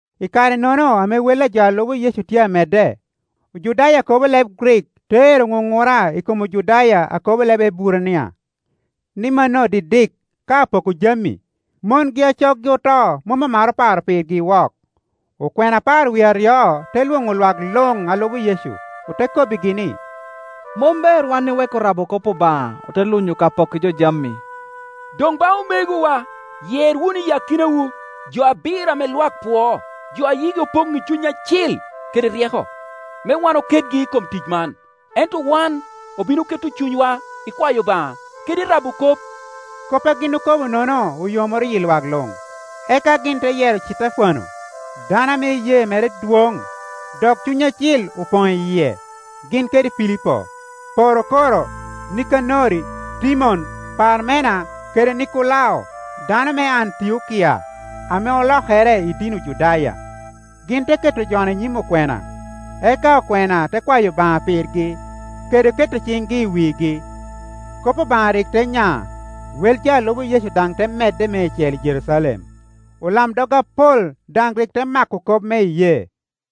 I kare-nono ame wel a jo a lubo Yecu tye amedde, Ojudaya a kobo leb Grik te ero ŋuŋura i kom Ojudaya a kobo leb Eburania, ni mano didik ka apoko jami, mongi a coggi oto mom omaro paro pirgi wok. Okwena apar wie aryo te lwoŋo lwak luŋ a lubo Yecu, ote kobbigi ni, “Mom ber wan iweko rabo kop Obaŋa, ote lunyo ka pokki jo jami. Doŋ ba omegowa, yer wunu i akinawu jo abiro ame lwak pwoo, jo a yigi Opoŋ i Cuny Acil kede ryeko, me wan oketgi i kom tic man. Ento wan obino keto cunywa i kwayo Obaŋa kede i rabo kop.” Kop a gin okobo-nono oyomoro yi lwak luŋ; eka gin te yero Citefano, dano ame iyee mere dwon dok Cuny Acil opoŋ i yie, gin kede Pilipo, Porokoro, Nikanori, Timon, Parmena kede Nikolao dano me Antiokia ame olokere i dini Ojudaya. Gin te keto jo-nu i nyim okwena, eka okwena te kwayo Obaŋa pirgi kede keto ciŋgi i wigi. Kop Obaŋa rik te nya; wel jo a lubo Yecu daŋ te medde meicel i Jerucalem, olamdog apol daŋ rik te mako kop me iyee.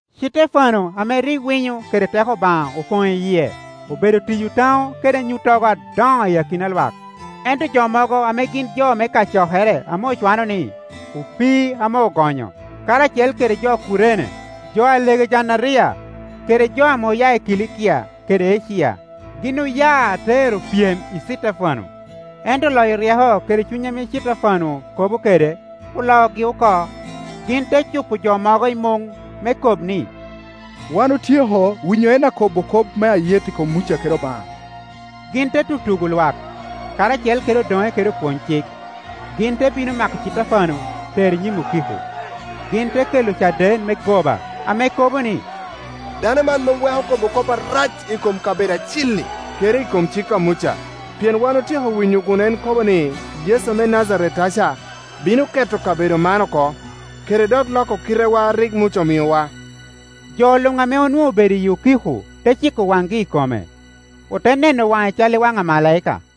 Citefano ame rik winyo kede teko Obaŋa open i yie, obedo tiyo taŋo kede anyuttogo adoŋo i akina lwak. Ento jo mogo ame gin jo me kacokere ame ocwano ni, “Opii ame Ogonyo”, karacel kede jo Kurene, jo Alegejanderia, kede jo ame oya i Kilikia kede Acia, gin oya te ero pyem i Citefano. Ento loyo ryeko kede Cuny ame Citefano kobo kede, oloogi oko. Gin te cupo jo mogo i muŋ me kob ni, “Wan otyeko winyo en akobo kop me ayet i kom Muca kede Obaŋa.” Gin te tutugo lwak, karacel kede odoŋe kede opwony-cik, gin te bino mako Citefano tero i nyim okiko. Gin te kela ocaden me goba ame kobo ni, “Dano man mom weko kobo kop arac i kom kabedo acil-li, kede i kom cik a Muca. Pien wan otyeko winyo kun en kobo ni, Yecu me Najaret-taca bino keto kabedo man oko, kede dok loko kitetwa a rik Muca omiowa.” Jo luŋ ame onwoŋo obedo i okiko te ciko waŋgi i kome; ote neno waŋe cal i wan amalaika.